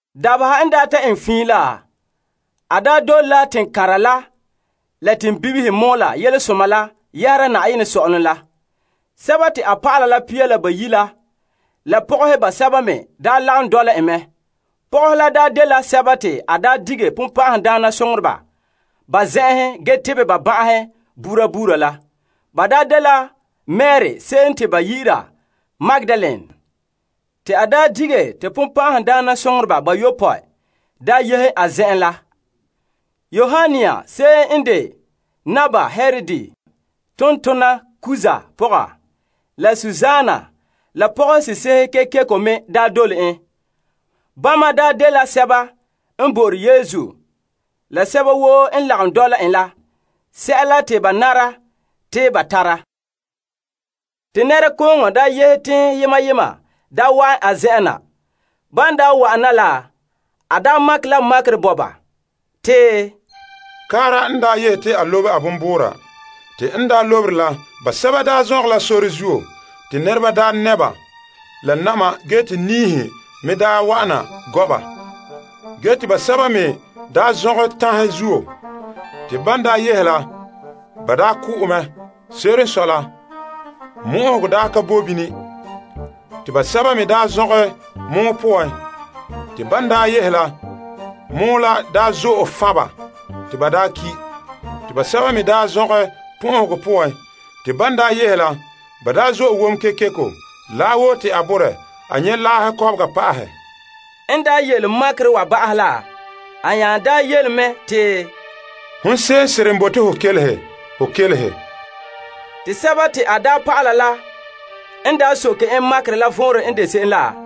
Dabeha n daa ta eŋɛ fiin la, a dole la teŋkanra la teŋbibihe mɔɔla Yelesoma la yɛhera Na'ayenɛ Sɔ'ɔlom la. Te a dɔlɔba la pia la bayi' la, la pɔgɔhe basɛba me daa lagom dɔla en mɛ. Pɔgɔhe la dela sɛba te a dige bonbɛ'ɛhe ba zen'enhen ge tebɛ ba ban'ahe buuri buuri la. Ba dela Mari se'em te ba yi'ira Magdalene, te a dige te bonbɛ'ɛhe bayopɔe yehe a zen'en la. Yoanna se'em n de Naba Herod tontona Kuza pɔga la Susana la pɔgɔse'ehe kekeko me dole en. Bama n de sɛba n bo'ore Yesu la sɛba woo n lagom dɔla en la sɛla te ba nara te ba tara. Te nɛrekooŋɔ daa yehe teŋhe yema yema daa wa'an a zen'en na. Ban wa'ana la, a makɛ la makerɛ bo ba. Te, kaara n yehe te a lobe a bonbuura. Te n lobere la, basɛba daa zɔngɛ la sore zuo te nɛreba daa nɛ' ba la na'ma ge te niihe me wa'ana gɔ' ba. Ge te basɛba me zɔngɛ tanhe zuo. Te ban yehe la, ba ko'e mɛ. Se'ere n sɔe la, mo'ohogɔ ka boe bini. Te basɛba me zɔngɛ gɔn'ɔhe poan. Te ban yehe la, gɔn'ɔhe la zo'e fan' ba te ba ki'. Te basɛba me zɔngɛ pɔn'ɔhegɔ poan. Te ban yehe la, ba zo'e wom kekeko laahe woo te a borɛ a nyɛ laahe kɔbega pa'ahɛ. N yele makerɛ wa ba'ahɛ la, a nya yele mɛ te, Hon se'em n tare toba ho kelehe. Te a dɔlɔba la n daa soke en makerɛ la vɔnrɛ n de se'em la,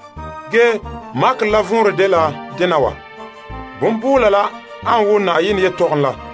Ge makerɛ la vɔnrɛ dela dena wa: bonbuula la ane wo Na'ayenɛ yelehom la.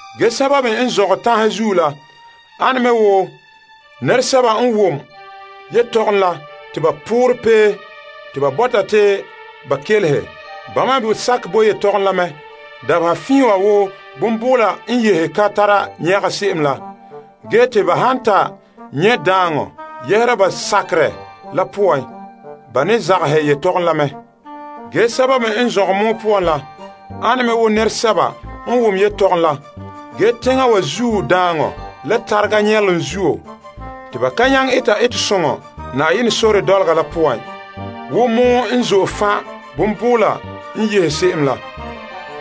Ge sɛba me n zɔngɛ tanhe zuo la ane me wo nɛresɛba n wom yelehom la te ba poorɛ pee te ba bɔta te ba kelehe. Bama me sakɛ bo yelehom la mɛ dabeha fiin wa wo bonbuula n yehe ka tara nyɛga se'em la. Ge te ba han ta nyɛ' daaŋɔ yɛhera ba sakerɛ la poan, ba ne zagahɛ yelehom la mɛ. Ge sɛba me n zɔngɛ gɔn'ɔhe poan la, ane me wo nɛresɛba n wom yelehom la. Ge teŋa wa zuo daaŋɔ, la tarega, la nyɛlom zuo, te ba ka nyaŋɛ eta etesoŋɔ Na'ayenɛ sore dɔlɔga la poan wo gɔn'ɔhe n zo'e fan' bonbuula n yehe se'em la.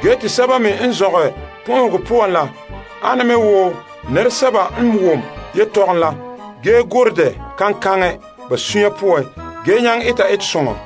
Ge te sɛba me n zɔngɛ pɔn'ɔhegɔ poan la ane me wo nɛresɛba n wom yelehom la ge gorɛ dɛ kaŋkaŋɛ ba sunya poan ge nyaŋɛ eta etesoŋɔ.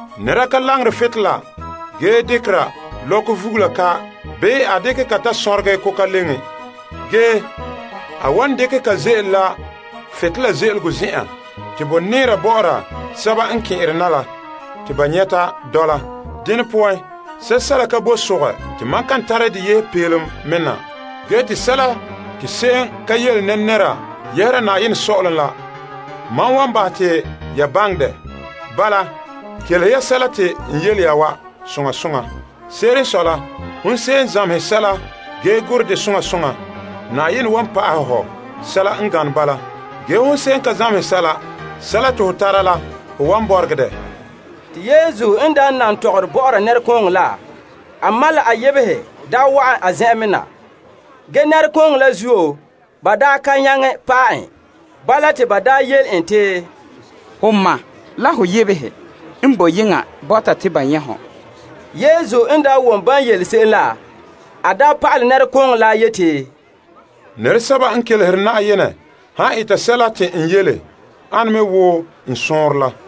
Nɛra ka langere butolela ge dekera lɔkɔ vugula ka bii a dekɛ ka ta sonregɛ koka leŋe, ge a wan dekɛ ka ze'ele la butolela ze'elego zen'en te bo nɛɛra bɔ'ɔra sɛba n kɛn'ɛra na la te ba nyɛta dɔla. Dene poan, sɛla ka boe sogɛ te mam kan tare de yehe peelom me na. Ge te sɛla te se'em ka yele nɛra yɛhera Na'ayenɛ Sɔ'ɔlom la, mam wan bahɛ te ya baŋɛ dɛ. Bala, kelehe ya sɛla te n yele ya wa soŋa soŋa. Se'ere n sɔe la, hon se'em n zamehɛ sɛla ge gurɛ dɛ soŋa soŋa, Na'ayenɛ wan pa'ahɛ hɔ sɛla n gane bala. Ge hon se'em n ka zamehɛ sɛla ge sɛla te ho tara la ho wan bɔregɛ dɛ. Te Yesu n daa nan tɔgɔre bɔ'ɔra nɛrekooŋɔ la, a ma la a yebehe daa wa'an a zen'en me na. Ge nɛrekooŋɔ la zuo, ba ka nyaŋɛ paɛ en. Bala te ba yele en te, Ho ma la ho yebehe n boe yeŋa bɔta te ba nyɛ' hɔ. Yesu n wom ban yele en se'em la, a pa'alɛ nɛrekooŋɔ la yeti, Nɛresɛba n kelehere Na'ayenɛ han eta sɛla te n yele ane me wo mam madoma la n sɔɔnrɔ la.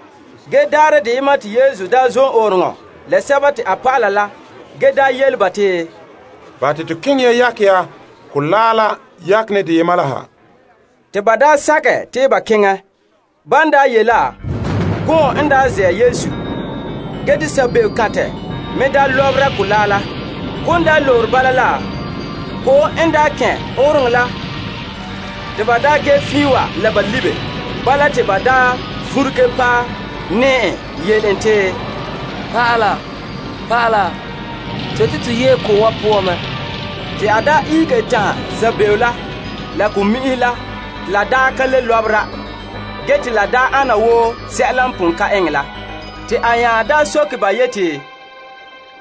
Ge daarɛ deyema te Yesu daa zom ɔɔnrɔŋɔ Yesu la a dɔlɔba la ge yele ba te, Bahɛ te to keŋɛ yakɛ ya mɔgɔrɛ la yakenɛ deyema la ha. Te ba sakɛ te ba keŋɛ. Ban ye' la, gɔɔm n tare Yesu. Ge te sabebekantɛ me lɔbera mɔgɔrɛ la. Ko'om lobere bala la, ko'om n daa kɛn' ɔɔnrɔŋɔ la te ba daa ge fiin wa la ba kile. Bala te ba vuruge paɛ nɛɛ en yele en te, Pa'ala, pa'ala, to yete to yee ko'om wa poan mɛ. Te a ihege tanhɛ sabego la la ko'mi'inhe la te ba ka le lɔbera ge te la ana wo sɛla n pon ka eŋɛ la. Te a nya daa soke ba yeti,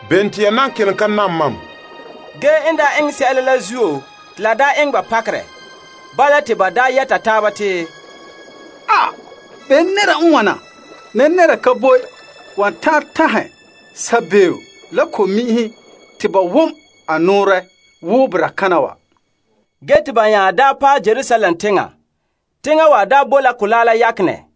Bene te ya nan kelom ka nam mam? Ge n eŋɛ sɛla la zuo te la eŋɛ ba pakerɛ. Bala te ba yɛta taaba te, Bene nɛra n wana wa? Nɛra ka boe wan ta'an tanhɛ ge sabeeo la ko'mi'inhe te ba wom a nɔɔrɛ wo boraa kana wa. Ge te ba nya daa paɛ Gerasadoma teŋa. Teŋa wa bo la mɔgɔrɛ la yakenɛ.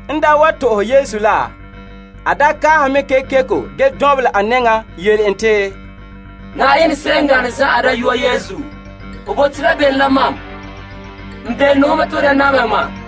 N wa to'ohɛ Yesu la, a kaahɛ mɛ kekeko ge lu Yesu nɛŋan yele en te, Na'ayenɛ se'em n gane zan'an Dayɔa Yesu, ho bote la bene la mam? N belone ho mɛ te ho da namehɛ mam.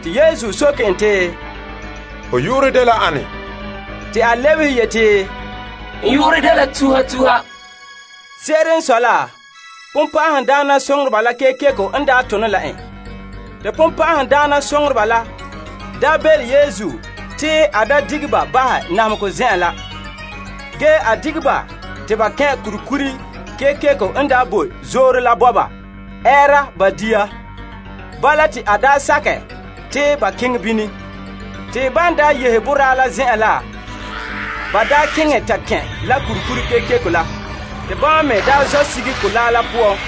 Te Yesu soke en te, Ho yu'urɛ dela ane? Te a lebehe yeti, N yu'urɛ dela Tuha Tuha. Se'ere n sɔe la, bonbɛ'ɛhe la kekeko n tone la en. Te bonbɛ'ɛhe la belom Yesu te a da dige ba bahɛ namehegɔ zen'en la. Ge a dige ba te ba kɛn' kurikuri kekeko n bo zoore la bɔba ɛɛra ba dia. Bala te a sakɛ te ba keŋɛ bini. Te ban yehe boraa la zen'en na la, ba keŋɛ ta kɛn' la kurikuri kekeko la. Te bama me zɔ' sige mɔgɔrɛ la poan.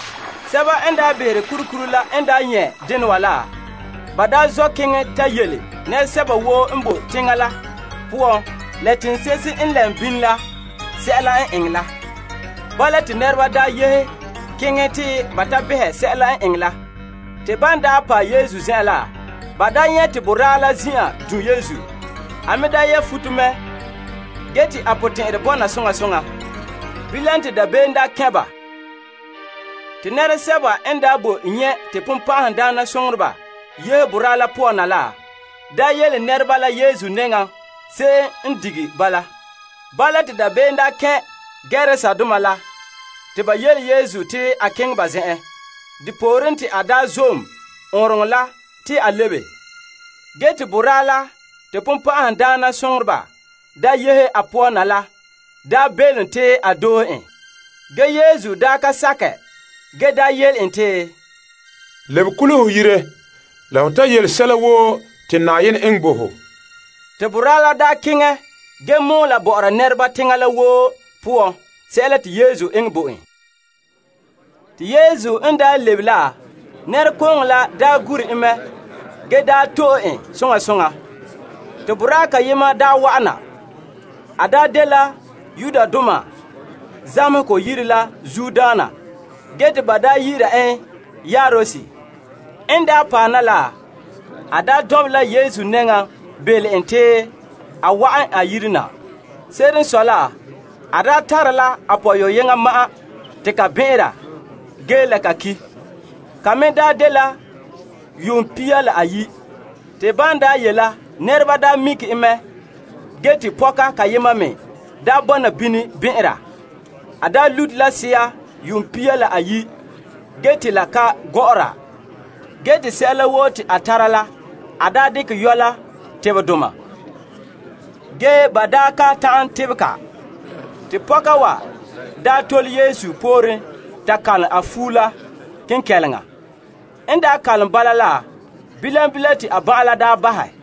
Sɛba n behere kurikuri la n nyɛ' dena wa la, ba zɔ' keŋɛ ta yele nɛresɛba woo n bo teŋa la poan la teŋse'ehe n lɛm bini la sɛla n eŋɛ la. Bala te nɛreba yehe keŋɛ te ba behɛ sɛla n eŋɛ la. Te ban paɛ Yesu zen'en la, ba nyɛ' te boraa la daa zin'an du' Yesu. A me yɛ' futo mɛ ge te a potɛn'ɛrɛ bɔna soŋa soŋa. Bilam te dabeem kɛn' ba. Te nɛresɛba n boe nyɛ' te bonbɛ'ɛhe yehe boraa la poan na la, yele nɛreba la Yesu nɛŋan se'em n dige ba la. Bala te dabeem kɛn' Gerasadoma la te ba yele Yesu te a keŋɛ ba zen'en. Depooren te a zom ɔɔnrɔŋɔ te a lebe. Ge te boraa la te bonbɛ'ɛhe yehe a poan na la belom te a doohe en. Ge Yesu ka sakɛ ge yele en te, Lebe kule ho yire la ho ta yele sɛla woo te Na'ayenɛ eŋɛ bo ho. Te boraa la keŋɛ ge mɔɔla bɔ'ɔra nɛreba teŋa la woo poan sɛla te Yesu eŋɛ bo en. Te Yesu n daa lebe la, nɛrekooŋɔ la gure en mɛ ge to'e en soŋa soŋa. Te boraa kayema daa wa'an na. A daa dela zamehegɔ yire la zuodaana ge te a yu'urɛ dɛna Yairus. N daa paɛ na la, a daa dɔnbelɛ la Yesu nɛŋan belom en te a wa'an a yire na. Se'ere n sɔe la, a daa tare la a pɔyɔyeŋɔ ma'an te ka bɛn'ɛnra ge la a ki'. Ka me daa dela yuun pia la ayi'. Te ban daa ye' la nɛreba daa mikere en mɛ ge te pɔka kayema me daa bɔna bini bɛn'ɛnra. A daa lute la sea yuun pia la ayi' ge te la ka gɔ'ɔra ge te sɛla woo te a tara la a yɔ' la tebadoma ge ba daa ka ta'an tebɛ ka. Te pɔka wa daa tole Yesu pooren ta kalom a fuo la kenkɛleŋa. N daa kalam bala la bilam bilam te a ban'an la daa bahɛ.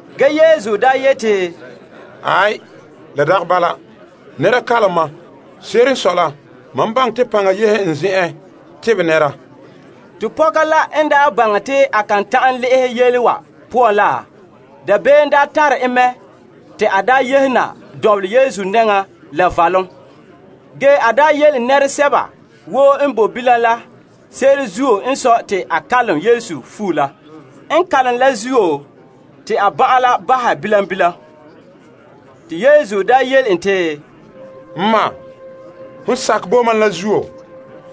Ge Yesu daa yeti, Aai, la dagɛ bala. Nɛra kalom mam. Se'ere n sɔe la, mam baŋɛ te paŋa yehe n zen'en tebɛ nɛra. Te pɔka la n daa baŋɛ te a kan ta'an le'ehɛ yele wa poan la, dabeem daa tare en mɛ te a daa yehe na dɔnbelɛ Yesu nɛŋa la valom. Ge a daa yele nɛresɛba woo n boe bilam la se'ere zuo n sɔe te a kalom Yesu fuo la, n kalom la zuo te a ban'an la bahɛ bilam bilam. Te Yesu daa yele en te, N ma, hon sakɛ bo mam la zuo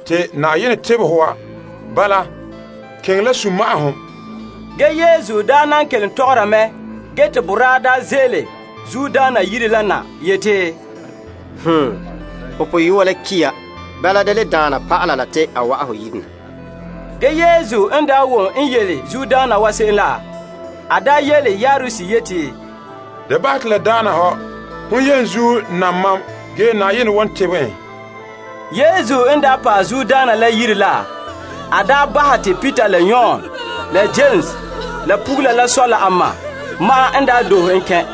te Na'ayenɛ tebɛ ho wa. Bala, keŋɛ la sunma'ahom. Ge Yesu daa nan kelom tɔgɔra mɛ ge te boraa daa ze'ele zuodaana yire la na yeti, Ho pɔyɔa la ki' ya. Bala da le daana pa'ala la te a wa'an ho yire na. Ge Yesu n daa wom n yele zuodaana wa se'em la, a daa yele Yairus te, Da bahɛ te la daana hɔ. Hon yenzuo nam mam ge Na'ayenɛ wan tebɛ en. Yesu n daa paɛ zuodaana la yire la a daa bahɛ te Peter la Yon la Yames la pugula la sɔ la a ma ma'an n doohe en kɛn'.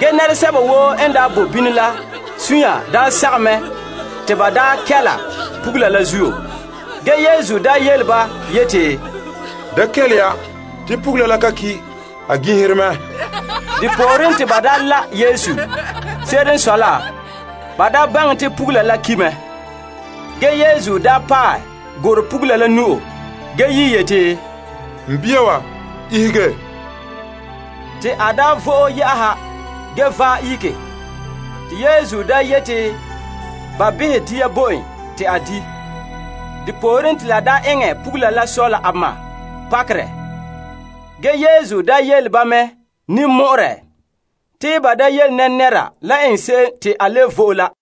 Ge nɛresɛba woo n daa bo bini la sunya daa sagom mɛ te ba daa kɛla pugula la zuo. Ge Yesu daa yele ba yeti, Da kele ya, te pugula la ka ki'. A gin'ihere mɛ. Wana zuo te ba daa la' Yesu. Se'ere n sɔe la, ba daa baŋɛ te pugula la ki' mɛ. Ge Yesu daa paɛ gurɛ pugula la nu'o ge yi' yeti, N bia wa, ihege. Te a daa vo'e yɛ'ɛha ge vaɛ ihege. Te Yesu daa yete ba behɛ dia bo en te a di'. Te la daa eŋɛ pugula la sɔ la a ma pakerɛ. Ge Yesu daa kan'an ba te ba da yele nɛra sɛla n eŋɛ la.